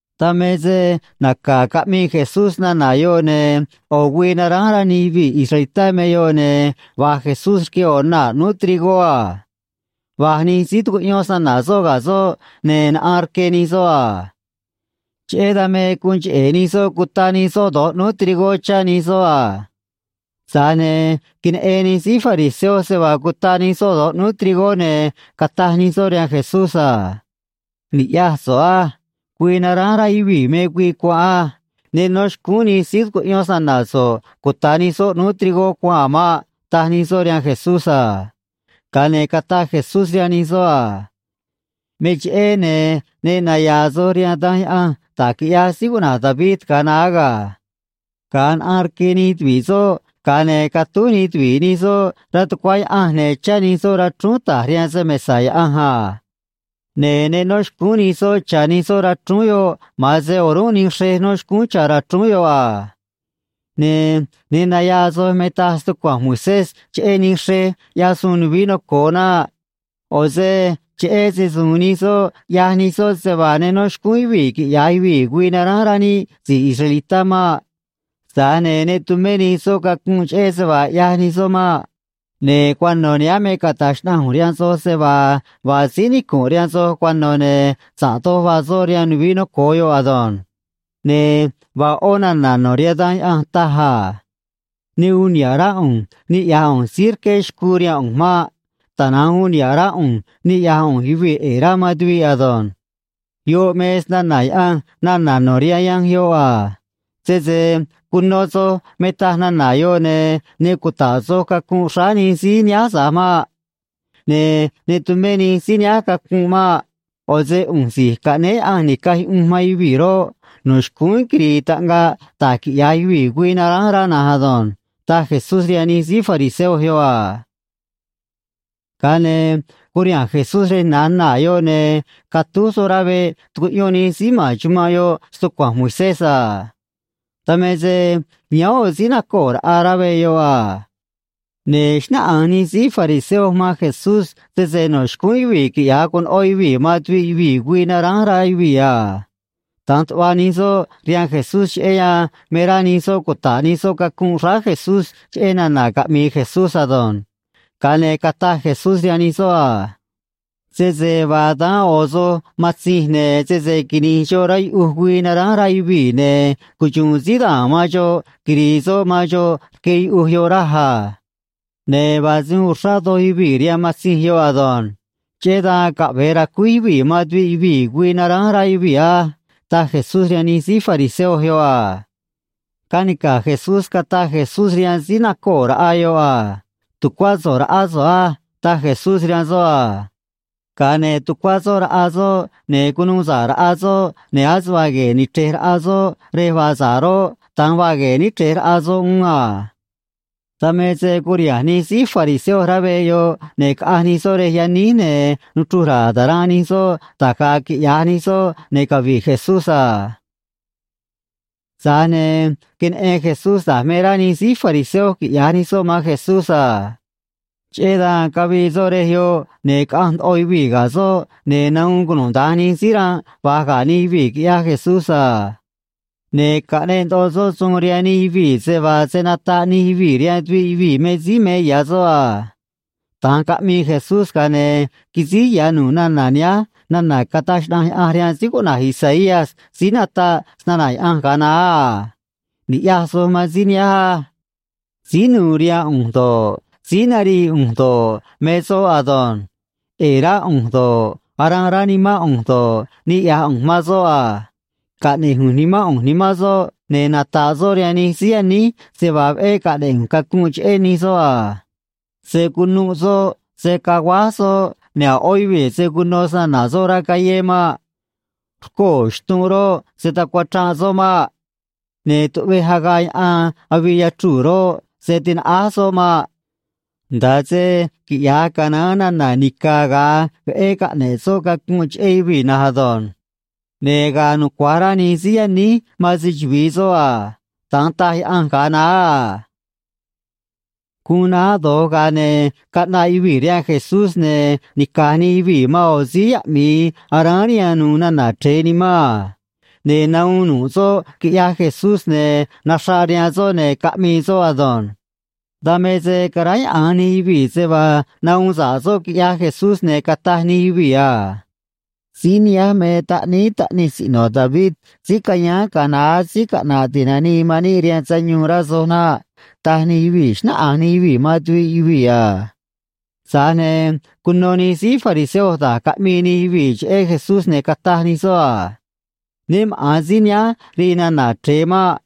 Dan me se naca̱ caꞌmii Jesús nana̱ yoꞌ, ne̱ ꞌo̱ güii naránj rá nij yuvii̱ israelitá me yoꞌ, ne̱ va̱j Jesús rque ꞌo̱ naa̱ ꞌnúú trigó a. Va̱j nij síí tucuꞌyón snana̱ soꞌ ga̱ soꞌ, ne̱ naꞌaan rque nij soꞌ a. Cheꞌé dan me guun cheꞌe̱ nij soꞌ cuta nij soꞌ do̱j ꞌnúú trigó chá nij soꞌ a. Tza̱j ne̱ queneꞌen nij síí fariseo se vaa cuta nij soꞌ do̱j ꞌnúú trigó, ne̱ cataj nij soꞌ rihaan Jesús a: ―Ni̱ꞌyaj so̱ꞌ á. Güii naránj rá yuvii̱ me güii cuanꞌ á. Ne nó xcúún nij síí tucuꞌyón snana̱ so̱ꞌ cuta̱ nij soꞌ ꞌnúú trigó cuanꞌ a̱ maꞌ ―taj nij soꞌ rihaan Jesús a. Ga̱a ne̱ cataj Jesús rihaan nij soꞌ a: ―Me cheꞌé, ne̱ ne naya̱a̱ soj rihaan Danj Yaꞌanj da̱j quiꞌyaj síí cuꞌna̱j David ga̱a naá ga̱. Ga̱a naꞌaan rque nij tuvi̱ꞌ nij soꞌ, ga̱a ne̱ catúj nij tuvi̱ꞌ nij soꞌ rá tucuá Yaꞌanj, ne̱ chá nij soꞌ rachrúún ta̱j rihaan se‑mesa̱ Yaꞌanj a. Ne̱ ne nó xcúún nij soꞌ cha̱ nij soꞌ rachrúún yoꞌ; ma̱an se o̱rúnꞌ nij xrej nó xcúún cha̱ rachrúún yoꞌ a. ’Ne̱ ne naya̱a̱ soj me taj stucua̱nj Moisés cheꞌé nij xrej ꞌyaj suun nuvií noco̱o naꞌ. ꞌO̱ se cheꞌé se‑su̱u̱n nij soꞌ, ꞌyaj nij soꞌ se vaa ne nó xcúún yuvii̱ quiꞌya̱j yuvii̱ güii naránj rá níꞌ si̱j israelitá maꞌ. Tza̱j ne̱ ne tumé nij soꞌ cacunꞌ cheꞌé se vaa ꞌyaj nij soꞌ maꞌ. Ne̱ cuano̱ nihánj me cata̱j xnaꞌanj ꞌu̱nj rihaan soj se vaa vaa síí nicu̱nꞌ rihaan soj cuano̱, ne̱ sa̱ꞌ doj vaa soꞌ rihaan nuvií noco̱o yoꞌ ado̱nj. Ne̱ vaa ꞌó nana̱ no̱ rihaan Danj Yaꞌanj taj a: “Ne uun niha̱ꞌ rá ꞌu̱nj niꞌya̱j ꞌu̱nj síí rqué xcuu rihaan ꞌu̱nj maꞌ. Tana̱nj uun niha̱ꞌ rá ꞌu̱nj niꞌya̱j ꞌu̱nj yuvii̱ ꞌe̱e̱ rá man tuviꞌ ado̱nj.” Yoꞌ me snana̱ Yaꞌanj nana̱ no̱ rihaan yanj yoꞌ a. Sese cuno soj me taj nana̱ yoꞌ, ne̱ ne cuta̱ꞌ soj cacunꞌ xráá nij síí nihánj tza̱j maꞌ. Ne̱ ne tumé nij síí nihánj cacunꞌ maꞌ. ꞌO̱ se ꞌu̱nj Si̱j Caꞌnéé Yaꞌanj Ni̱caj Yuꞌunj man Yuvii̱ roꞌ, no̱ xcúnj quiri̱i̱ taꞌngaj da̱j quiꞌya̱j yuvii̱ güii naránj rá na̱nj ado̱nj ―taj Jesús rihaan nij síí fariseo yoꞌ a. Ga̱a ne̱ curiha̱nj Jesús rej na̱j naa̱ yoꞌ, ne̱ catúj soꞌ rá veꞌ tucuꞌyón nij síí ma̱n chumanꞌ yoꞌ stucua̱nj Moisés a. Dan me se yáán ꞌo̱ síí nacoo̱ raꞌa rá veꞌ yoꞌ a. Ne̱ xnáꞌanj nij síí fariseo man Jesús sese no̱ xcúún yuvii̱ quiꞌya̱j conoꞌó yuvii̱ man tuviꞌ yuvii̱ güii naránj rá yuvii̱ a. Da̱nj tuꞌva nij soꞌ rihaan Jesús, cheꞌé yan me rá nij soꞌ cuta̱ꞌ nij soꞌ cacunꞌ xráá Jesús cheꞌé nana̱ caꞌmi̱i̱ Jesús ado̱nj. Ga̱a ne̱ cataj Jesús rihaan nij soꞌ a: ―Sese vaa daán ꞌo̱ soj matzinj, ne̱ sese quini̱j xoꞌ rá yuꞌuj güii naránj rá yuvii̱, ne̱ cuxu̱u̱n síí da̱a̱n man xoꞌ quiri̱i̱ soꞌ man xoꞌ rque yuꞌuj yoꞌ, raj a. Ne̱ vaa se uun uxrá doj yuvii̱ rihaan matzinj yoꞌ ado̱nj. Cheꞌé dan caꞌve̱e ra̱cuíj yuvii̱ man tuviꞌ yuvii̱ güii naránj rá yuvii̱ á ―taj Jesús rihaan nij síí fariseo yoꞌ a. Canica̱j Jesús cataj Jesús rihaan síí nacoo̱ raꞌa yoꞌ a: ―Tu̱cuá so̱ꞌ raꞌá so̱ꞌ á ―taj Jesús rihaan soꞌ a. Ga̱a ne̱ tucuá soꞌ raꞌa soꞌ, ne̱ cunuu sa̱ꞌ raꞌa soꞌ, ne̱ ase vaa gue̱e̱ ni̱chrej raꞌa soꞌ rej vaa sa̱ꞌ roꞌ, da̱nj vaa gue̱e̱ níchrej raꞌa soꞌ uún a. Dan me se curiha̱nj nij síí fariseo rá veꞌ yoꞌ, ne̱ caꞌanj nij soꞌ rej yaníj, ne̱ nuchruj ra̱a̱ ta̱ranꞌ nij soꞌ da̱j ga̱a̱ quiꞌya̱j nij soꞌ ne̱ cavi̱ꞌ Jesús a. Tza̱j ne̱ queneꞌen Jesús da̱j me rá nij síí fariseo quiꞌya̱j nij soꞌ man Jesús a. Cheꞌé dan cavii soꞌ rej yoꞌ, ne̱ caꞌanj ndoꞌo yuvii̱ ga̱ soꞌ, ne̱ nahuun cunuda̱nj nij síí ranꞌ va̱j ga̱ nij yuvii̱, quiꞌyaj Jesús a. Ne̱ caꞌneꞌ ndoꞌo soꞌ suun rihaan nij yuvii̱ se vaa se̱ nataꞌ nij yuvii̱ rihaan tuviꞌ yuvii̱ me síí me ya̱ soꞌ a. Da̱nj caꞌmii Jesús, ga̱a ne̱ quisíj ya̱ nu̱ꞌ nana̱ nihánj nana̱ cataj xnaꞌanj Yaꞌanj rihaan síí cuꞌna̱j Isaías síí nataꞌ snana̱ Yaꞌanj ga̱a naá a: Ni̱ꞌyaj soj man síí nihánj á. Síí nu̱u̱ rihaan ꞌu̱nj do̱ꞌ, síí narii ꞌu̱nj do̱ꞌ, me soꞌ ado̱nj. ꞌE̱e̱ rá ꞌu̱nj do̱ꞌ, aranꞌ rá nimán ꞌu̱nj do̱ꞌ, niꞌya̱j ꞌu̱nj man soꞌ a. Caꞌne̱j ꞌu̱nj Nimán ꞌu̱nj nimán soꞌ, ne̱ nata̱ꞌ soꞌ rihaan nij síí yaníj se vaa veꞌé caꞌne̱ꞌ ꞌu̱nj cacunꞌ cheꞌé nij soꞌ a. Se̱ cunuꞌ soꞌ, se̱ caguáj soꞌ, ne̱ a̱ ꞌó yuvii̱ se̱ cuno snana̱ soꞌ rá callé maꞌ. Rcoo̱ xtunꞌ roꞌ, se̱ tacuachranꞌ soꞌ maꞌ. Ne̱ tuꞌvej agaꞌ yaꞌan avii yachruu̱ roꞌ, se̱ tinaꞌáj soꞌ maꞌ, nda̱a se quiꞌya̱j canaán nana̱ nica̱ ga̱a veꞌé caꞌne̱ꞌ soꞌ cacunꞌ cheꞌé yuvii̱ na̱nj ado̱nj. Ne̱ ga̱a̱ nucua̱j rá nij síí yaníj man se‑chuvi̱i soꞌ a. Da̱nj taj Yaꞌanj ga̱a naá a. Guun naá do̱j, ga̱a ne̱ caꞌnaꞌ yuvii̱ rihaan Jesús, ne̱ nica̱j nij yuvii̱ man ꞌo̱ síí yaꞌmi̱i aráán rihaan nu̱u̱ nana̱ chre̱e nimán a. Ne̱ nahuun nu̱ꞌ soꞌ, quiꞌyaj Jesús, ne̱ naxraꞌ rihaan soꞌ, ne̱ caꞌmii soꞌ ado̱nj. Dan me se caráyaꞌa̱nj nij yuvii̱ se vaa nahuun sa̱ꞌ soꞌ quiꞌyaj Jesús, ne̱ cataj nij yuvii̱ a: ―Síí nihánj me Taꞌníí Taꞌnij Siꞌno̱ David síí cayáán ga̱a naá, síí caꞌna̱ꞌ ti̱nanii man níꞌ rihaan sayuun, rá soj naꞌ ―taj nij yuvii̱, xnáꞌanj nij yuvii̱ man tuviꞌ yuvii̱ a. Tza̱j ne̱ cuno nij síí fariseo da̱j caꞌmii nij yuvii̱ cheꞌé Jesús, ne̱ cataj nij soꞌ a: ―Né maꞌa̱n síí nihánj rii nana̱ chre̱e maꞌ.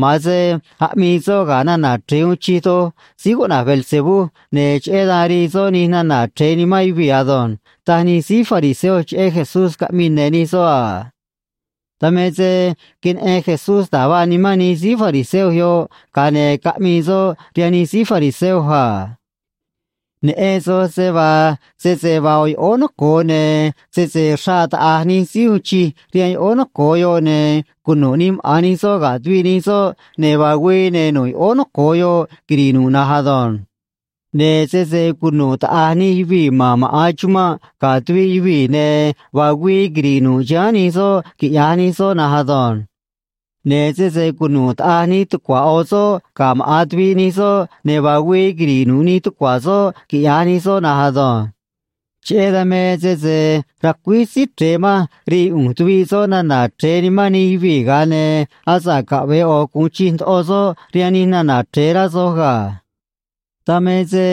Ma̱an se aꞌmii soꞌ ga̱ nana̱ chre̱e uun chij doj, síí cuꞌna̱j Beelzebú, ne̱ cheꞌé dan rii soꞌ nij nana̱ chre̱e nimán yuvii̱ ado̱nj ―taj nij síí fariseo cheꞌé Jesús, caꞌmii ne̱ nij soꞌ a. Dan me se queneꞌen Jesús da̱j vaa nimán nij síí fariseo yoꞌ, ga̱a ne̱ caꞌmii soꞌ rihaan nij síí fariseo a: ―Neꞌen soj se vaa sese vaa ꞌo̱ yoꞌóó noco̱o, ne̱ sese xraꞌ taꞌa̱j nij síí uun chij rihaan yoꞌóó noco̱o yoꞌ ne̱ cunu̱ꞌ nij maꞌa̱n nij soꞌ ga̱ tuviꞌ nij soꞌ, ne̱ vaa güii, ne̱ nu̱ꞌ yoꞌóó noco̱o yoꞌ quiri̱ꞌ nu̱ꞌ na̱nj ado̱nj. Ne̱ sese cunu̱ꞌ taꞌa̱j nij yuvii̱ ma̱n maꞌa̱n chumanꞌ ga̱ tuviꞌ yuvii̱, ne̱ vaa güii quiri̱ꞌ nu̱ꞌ chiháán nij soꞌ, quiꞌya̱j nij soꞌ na̱nj ado̱nj. Ne̱ sese cunu̱ꞌ taꞌa̱j nij tucua̱ ꞌo̱ soꞌ ga̱ maꞌa̱n tuviꞌ nij soꞌ, ne̱ vaa güii quiri̱ꞌ nu̱ꞌ nij tucua̱ soꞌ, quiꞌya̱j nij soꞌ na̱nj ado̱nj. Cheꞌé dan me sese racuíj Síí Chre̱e manj rii ꞌu̱nj tuviꞌ soꞌ nana̱ chre̱e nimán nij yuvii̱, ga̱a ne̱ asa̱ꞌ caꞌve̱e ꞌo̱ gu̱un chij ndoꞌo soꞌ rihaan nij nana̱ chre̱e, rá soj ga̱. Dan me se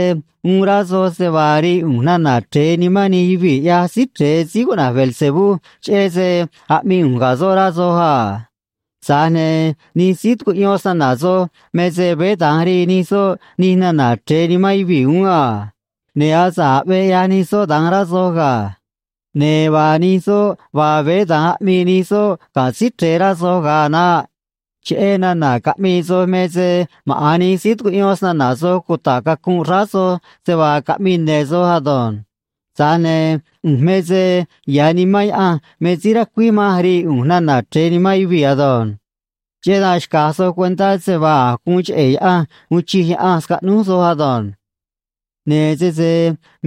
uun rá soj se vaa rii ꞌu̱nj nana̱ chre̱e nimán nij yuvii̱, ꞌyaj Síí Chre̱e, síí cuꞌna̱j Beelzebú, cheꞌé se aꞌmii ꞌu̱nj ga̱ soꞌ, rá soj a. Tza̱j ne̱ nij síí tucuꞌyón snana̱ soj me se veé da̱nj rii nij soꞌ nij nana̱ chre̱e nimán yuvii̱ uún a. Ne̱ asa̱ꞌ aꞌvee ꞌyaj nij soꞌ da̱nj, rá soj ga̱. Ne̱ vaa nij soꞌ vaa, veé da̱nj aꞌmii nij soꞌ ga̱ Síí Chre̱e, rá soj ga̱a a̱ naꞌ. Cheꞌé nana̱ caꞌmii soj me se maꞌa̱n nij síí tucuꞌyón snana̱ soj cuta̱ꞌ cacunꞌ xráá soj se vaa caꞌmii ne̱ soj ado̱nj. Tza̱j ne̱ ꞌu̱nj me se ya̱ Nimán Yaꞌanj me síí racuíj manj rii ꞌu̱nj nana̱ chre̱e nimán yuvii̱ ado̱nj. Cheꞌé dan xca̱j soj cuentá se vaa a̱j guun cheꞌe̱ Yaꞌanj uun chij Yaꞌanj scaꞌnúj soj ado̱nj. ’Ne̱ sese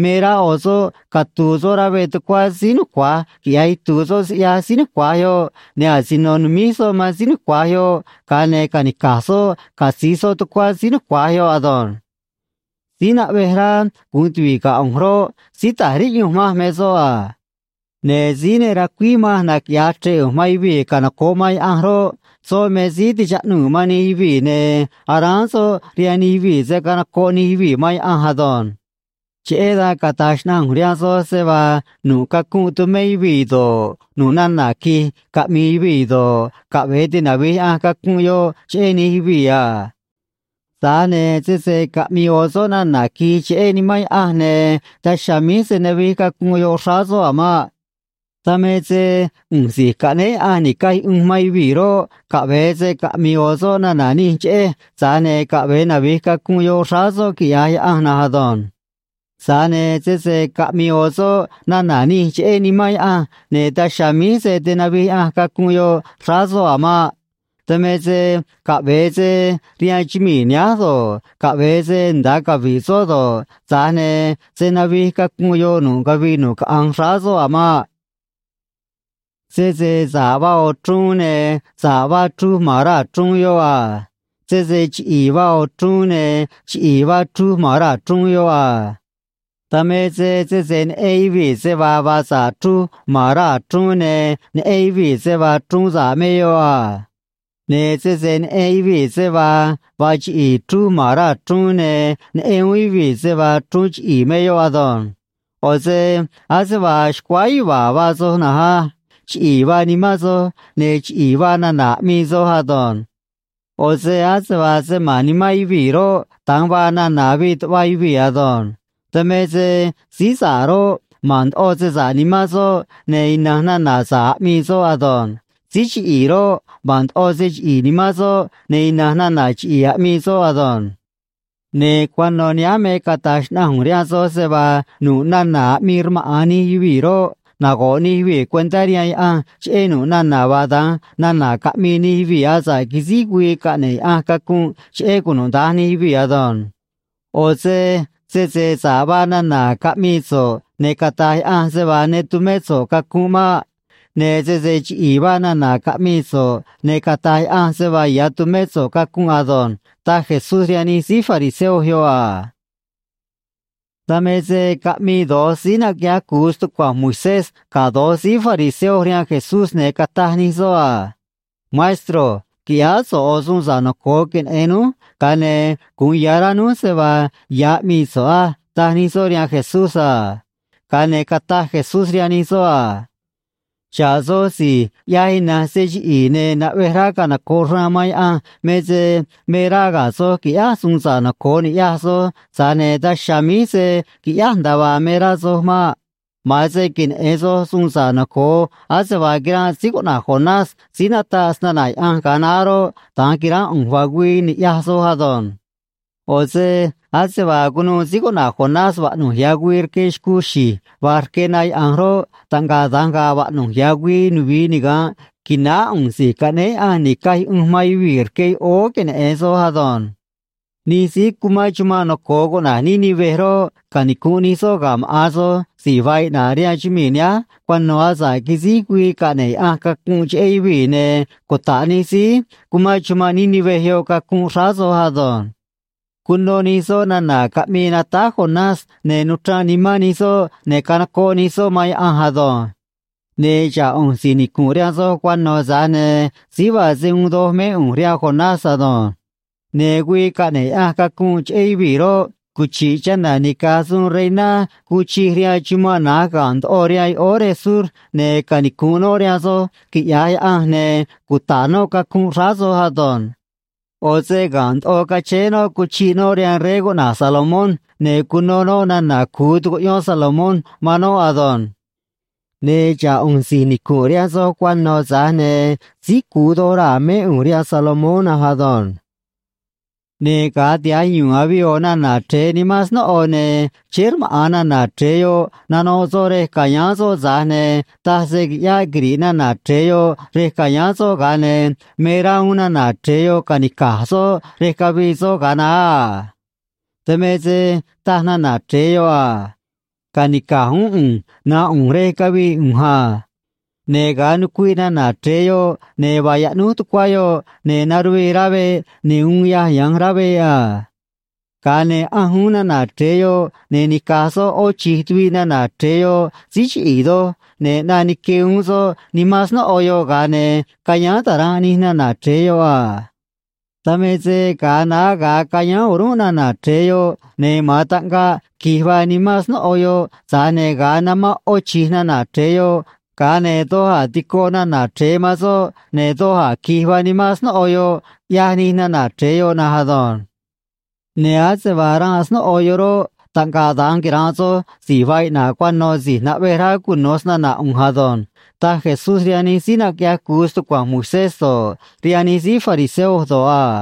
me rá ꞌo̱ soꞌ catu̱u̱ soꞌ rá veꞌ tucuá síí nucua̱j quiꞌya̱j itu̱u̱ soꞌ siꞌyaj síí nucua̱j yoꞌ, ne̱ asino nu̱míj soꞌ man síí nucua̱j yoꞌ, ga̱a ne̱ ca̱nica̱j soꞌ catzi̱j soꞌ tucuá síí nucua̱j yoꞌ ado̱nj. ’Síí naꞌvej rá gu̱un tuvi̱ꞌ ga̱ ꞌu̱nj roꞌ, síí ta̱j riꞌyunj manj me soꞌ a. Ne̱ síí ne racuíj manj naquiꞌya̱j chre̱ꞌ ꞌu̱nj man yuvii̱ canoco̱ꞌ man Yaꞌanj roꞌ, soꞌ me síí tichaꞌnuu̱ man nij yuvii̱, ne̱ aráán soꞌ rihaan nij yuvii̱ se̱ canocoꞌ nij yuvii̱ man Yaꞌanj ado̱nj. ’Cheꞌé dan cata̱j xnaꞌanj ꞌu̱nj rihaan soj se vaa nu̱ꞌ cacunꞌ tu̱mé yuvii̱ do̱ꞌ, nu̱ꞌ nana̱ qui̱j caꞌmi̱i̱ yuvii̱ do̱ꞌ, caꞌve̱e tinavi̱j Yaꞌanj cacunꞌ yoꞌ cheꞌé nij yuvii̱ a. Tza̱j ne̱ sese caꞌmi̱i̱ ꞌo̱ soꞌ nana̱ qui̱j cheꞌé Nimán Yaꞌanj, ne̱ daj chiha̱a̱ míj se̱ navij cacunꞌ yoꞌ xráá soꞌ a̱ maꞌ. Dan me se ꞌu̱nj Si̱j Caꞌnéé Yaꞌanj Ni̱caj Yuꞌunj man Yuvii̱ roꞌ, caꞌve̱e se caꞌmi̱i̱ ꞌo̱ soꞌ nana̱ nij cheꞌej, tza̱j ne̱ caꞌve̱e navi̱j cacunꞌ yoꞌ xráá soꞌ quiꞌya̱j Yaꞌanj na̱nj ado̱nj. Tza̱j ne̱ sese caꞌmi̱i̱ ꞌo̱ soꞌ nana̱ nij cheꞌé Nimán Yaꞌanj, ne̱ daj chiha̱a̱ míj se̱ tinavij Yaꞌanj cacunꞌ yoꞌ xráá soꞌ a̱ maꞌ. Dan me se caꞌve̱e se rihaan chumii̱ nihánj do̱ꞌ, caꞌve̱e se nda̱a cavi̱ꞌ soꞌ do̱ꞌ, tza̱j ne̱ se̱ navij cacunꞌ yoꞌ nu̱ꞌ cavii nu̱ꞌ caꞌanj xráá soꞌ a̱ maꞌ. ’Sese sa̱ꞌ vaa ꞌo̱ chruun, ne̱ sa̱ꞌ vaa chruj ma̱n raa̱ chruun yoꞌ a. Sese chiꞌi̱i̱ vaa ꞌo̱ chruun ne̱ chiꞌi̱i̱ vaa chruj ma̱n raa̱ chruun yoꞌ a. Dan me se sese neꞌen yuvii̱ se vaa vaa sa̱ꞌ chruj ma̱n raa̱ chruun, ne̱ neꞌen yuvii̱ se vaa chruun sa̱ꞌ me yoꞌ a. Ne̱ sese neꞌen yuvii̱ se vaa vaa chiꞌi̱i̱ chruj ma̱n raa̱ chruun, ne̱ neꞌen uún yuvii̱ se vaa chruun chiꞌi̱i̱ me yoꞌ ado̱nj. ꞌO̱ se ase vaa xcuáá yuva̱a̱ vaa soj na̱nj á. Chiꞌi̱i̱ vaa nimán soj, ne̱ chiꞌi̱i̱ vaa nana̱ aꞌmii soj ado̱nj. ꞌO̱ se ase vaa se ma̱n nimán yuvii̱ roꞌ, da̱nj vaa nana̱ avii tuꞌva yuvii̱ ado̱nj. Dan me se síí sa̱ꞌ roꞌ, ma̱n ndoꞌo se sa̱ꞌ nimán soꞌ, ne̱ ina̱nj nana̱ sa̱ꞌ aꞌmii soꞌ ado̱nj. Síí chiꞌi̱i̱ roꞌ, ma̱n ndoꞌo se chiꞌi̱i̱ nimán soꞌ, ne̱ ina̱nj nana̱ chiꞌi̱i̱ aꞌmii soꞌ ado̱nj. Ne̱ cuano̱ nihánj me cata̱j xnaꞌanj ꞌu̱nj rihaan soj se vaa nu̱ꞌ nana̱ aꞌmii rmaꞌa̱n nij yuvii̱ roꞌ, nago̱ꞌ nij yuvii̱ cuentá rihaan Yaꞌanj cheꞌé nu̱ꞌ nana̱ vaa da̱nj nana̱ caꞌmii nij yuvii̱ asa̱ꞌ quisíj güii caꞌne̱ꞌ Yaꞌanj cacunꞌ cheꞌé cunuda̱nj nij yuvii̱ ado̱nj. ꞌO̱ se sese sa̱ꞌ vaa nana̱ caꞌmii so̱ꞌ, ne̱ cata̱j Yaꞌanj se vaa ne tumé so̱ꞌ cacunꞌ maꞌ. Ne̱ sese chiꞌi̱i̱ vaa nana̱ caꞌmii so̱ꞌ, ne̱ cata̱j Yaꞌanj se vaa ya̱ tumé so̱ꞌ cacunꞌ ado̱nj ―taj Jesús rihaan nij síí fariseo yoꞌ a. Dan me se caꞌmii do̱j síí naquiꞌyaj cu̱u stucua̱nj Moisés ga̱ do̱j síí fariseo rihaan Jesús, ne̱ cataj nij soꞌ a: ―Maestro, qui̱ꞌyáá so̱ꞌ ꞌo̱ suun sa̱ꞌ noco̱o queneꞌe̱n núj, ga̱a ne̱ gu̱un ya̱ rá núj se vaa ya̱ aꞌmii so̱ꞌ á ―taj nij soꞌ rihaan Jesús a. Ga̱a ne̱ cataj Jesús rihaan nij soꞌ a: ―Xa̱ꞌ soj si̱j ꞌyaj ina̱nj se chiꞌi̱i̱ ne̱ naꞌvej rá canoco̱ꞌ xraan man Yaꞌanj me se me rá ga̱a̱ soj qui̱ꞌyáj suun sa̱ꞌ noco̱o ni̱ꞌyaj soj, tza̱j ne̱ daj chiha̱a̱ míj se̱ quiꞌyáj nda̱a vaa me rá soj maꞌ. Ma̱an se queneꞌe̱n soj suun sa̱ꞌ noco̱o ase vaa quiranꞌ síí cuꞌna̱j Jonás síí nataꞌ snana̱ Yaꞌanj ga̱a naá roꞌ, da̱nj qui̱ránꞌ ꞌu̱nj, vaa güii, ni̱ꞌyaj soj ado̱nj. ꞌO̱ se ase vaa cunuû síí cuꞌna̱j Jonás vaꞌnu̱j ya̱ güii rque xcuu xi̱j va̱j rque na yaꞌa̱nj roꞌ, taꞌngaꞌ da̱nj ga̱a̱ vaꞌnu̱j ya̱ güii nuvi̱i niga̱nꞌ qui̱náá ꞌu̱nj Si̱j Caꞌnéé Yaꞌanj Ni̱caj Yuꞌunj man Yuvii̱ rque yoꞌóó queneꞌe̱n soj ado̱nj. Nij síí cumán chumanꞌ noco̱o cuꞌna̱j Nínive roꞌ, canicu̱nꞌ nij soꞌ ga̱ maꞌa̱n soj si̱j vaa iꞌna̱ꞌ rihaan chumii̱ nihánj cuano̱ asa̱ꞌ quisíj güii caꞌne̱ꞌ Yaꞌanj cacunꞌ cheꞌé yuvii̱, ne̱ cuta̱ꞌ nij síí cumán chumanꞌ Nínive yoꞌ cacunꞌ xráá soj ado̱nj. Cuno nij soꞌ nana̱ caꞌmii natáj Jonás, ne̱ nuchranꞌ nimán nij soꞌ, ne̱ canocoꞌ nij soꞌ man Yaꞌanj ado̱nj. Ne̱ xa̱ꞌ ꞌu̱nj si̱j nicu̱nꞌ rihaan soj cuano̱, tza̱j ne̱ síí vaa se uun doj mé ꞌu̱nj rihaan Jonás ado̱nj. Ne̱ güii caꞌne̱ꞌ Yaꞌanj cacunꞌ cheꞌé yuvii̱ roꞌ, cuchi̱ꞌ chana̱ nica̱j suun reiná guun chij rihaan chumanꞌ na̱j ga̱nꞌ ndoꞌo rihaan yoꞌóó rej sur, ne̱ canicu̱nꞌ noꞌ rihaan soj, quiꞌya̱j Yaꞌanj, ne̱ cuta̱ꞌ noꞌ cacunꞌ xráá soj ado̱nj. ꞌO̱ se ga̱nꞌ ndoꞌo cachéé noꞌ cuchi̱ꞌ noꞌ rihaan rey cuꞌna̱j Salomón, ne̱ cuno noꞌ nana̱ cu̱u tucuꞌyón Salomón man noꞌ ado̱nj. Ne̱ xa̱ꞌ ꞌu̱nj si̱j nicu̱nꞌ rihaan soj cuano̱, tza̱j ne̱ síí cu̱u doj raa̱ mé ꞌu̱nj rihaan Salomón na̱nj ado̱nj. ’Ne̱ ga̱a tiha̱j yu̱u̱n avii ꞌo̱ nana̱ chre̱e nimán snóꞌo, ne̱ chéé rmaꞌa̱n nana̱ chre̱e yoꞌ nanoꞌ soꞌ rej ca̱yáán soꞌ, tza̱j ne̱ taj se qui̱ꞌyáꞌ quiri̱ꞌ nana̱ chre̱e yoꞌ rej ca̱yáán soꞌ, ga̱a ne̱ me rá uún nana̱ chre̱e yoꞌ ca̱nica̱j soꞌ rej cavii soꞌ ga̱a naá a. Dan me se taj nana̱ chre̱e yoꞌ a: “Ca̱nica̱j uún ꞌu̱nj na̱nꞌ ꞌu̱nj rej cavii ꞌu̱nj a.” Ne̱ ga̱a nucuiꞌ nana̱ chre̱e yoꞌ, ne̱ vaa yaꞌnúj tucuá yoꞌ, ne̱ naruvii rá veꞌ, ne̱ uun yaj ya̱nj rá veꞌ a. Ga̱a ne̱ ꞌanj uún nana̱ chre̱e yoꞌ, ne̱ nica̱j soꞌ ꞌó chi̱j tuviꞌ nana̱ chre̱e yoꞌ síí chiꞌi̱i̱ doj, ne̱ ꞌnaꞌ nique uún soꞌ nimán snóꞌo yoꞌ, ga̱a ne̱ ca̱yáán ta̱ranꞌ nij nana̱ chre̱e yoꞌ a. Dan me se ga̱a naá ga̱a cayáán o̱rúnꞌ nana̱ chre̱e yoꞌ, ne̱ ma̱an taꞌngaꞌ qui̱j vaa nimán snóꞌo yoꞌ, tza̱j ne̱ ga̱a namán ꞌó chi̱j nana̱ chre̱e yoꞌ, ga̱a ne̱ doj a̱ tico nana̱ chre̱e man soꞌ, ne̱ doj a̱ qui̱j vaa nimán snóꞌo yoꞌ, ꞌyaj nij nana̱ chre̱e yoꞌ na̱nj ado̱nj. ’Ne̱ ase vaa ranꞌ snóꞌo yoꞌ roꞌ, taꞌngaꞌ da̱nj quira̱nꞌ soj si̱j vaa iꞌna̱ꞌ cuano̱ si̱j naꞌvej rá cuno̱ snana̱ ꞌu̱nj ado̱nj ―taj Jesús rihaan nij síí naquiꞌyaj cu̱u stucua̱nj Moisés do̱ꞌ, rihaan nij síí fariseo do̱ꞌ a.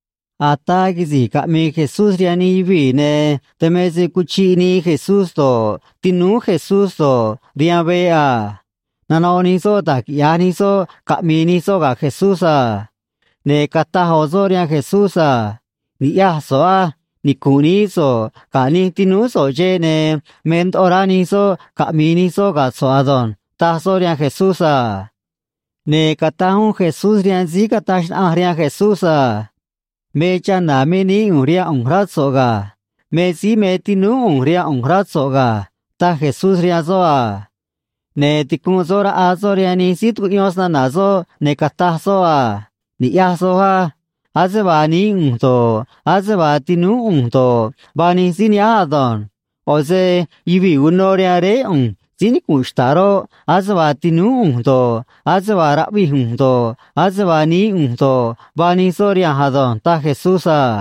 Ataa quisi̱j caꞌmii Jesús rihaan nij yuvii̱, ne̱ dan me se cuchiꞌ nii Jesús do̱ꞌ, tinúú Jesús do̱ꞌ, rihaan veꞌ a. Nanoꞌ nij soꞌ da̱j quiꞌya̱j nij soꞌ caꞌmi̱i̱ nij soꞌ ga̱ Jesús a. Ne̱ cataj ꞌo̱ soꞌ rihaan Jesús a: ―Ni̱ꞌyaj so̱ꞌ á. Nicu̱nꞌ nií so̱ꞌ ga̱ nij tinúú so̱ꞌ xeꞌ, ne̱ me ndoꞌo rá nij soꞌ caꞌmi̱i̱ nij soꞌ ga̱ so̱ꞌ ado̱nj ―taj soꞌ rihaan Jesús a. Ne̱ cataj uún Jesús rihaan síí cataj xnaꞌanj rihaan Jesús a: ―Me chana̱ me nií ꞌu̱nj rihaan ꞌu̱nj, rá so̱ꞌ ga̱. Me síí me tinúú ꞌu̱nj rihaan ꞌu̱nj, rá so̱ꞌ ga̱ ―taj Jesús rihaan soꞌ a. Ne̱ ticunꞌ soꞌ raꞌa soꞌ rihaan nij síí tucuꞌyón snana̱ soꞌ, ne̱ cataj soꞌ a: ―Ni̱ꞌyaj soj á. Ase vaa nií ꞌu̱nj do̱ꞌ, ase vaa tinúú ꞌu̱nj do̱ꞌ, vaa nij síí nihánj ado̱nj. ꞌO̱ se yuvii̱ uno rihaan Réé ꞌu̱nj síí nicu̱nꞌ xta̱ꞌ roꞌ, ase vaa tinúú ꞌu̱nj do̱ꞌ, ase vaa raꞌvij ꞌu̱nj do̱ꞌ, ase vaa nií ꞌu̱nj do̱ꞌ, vaa nij soꞌ rihanj ado̱nj ―taj Jesús a.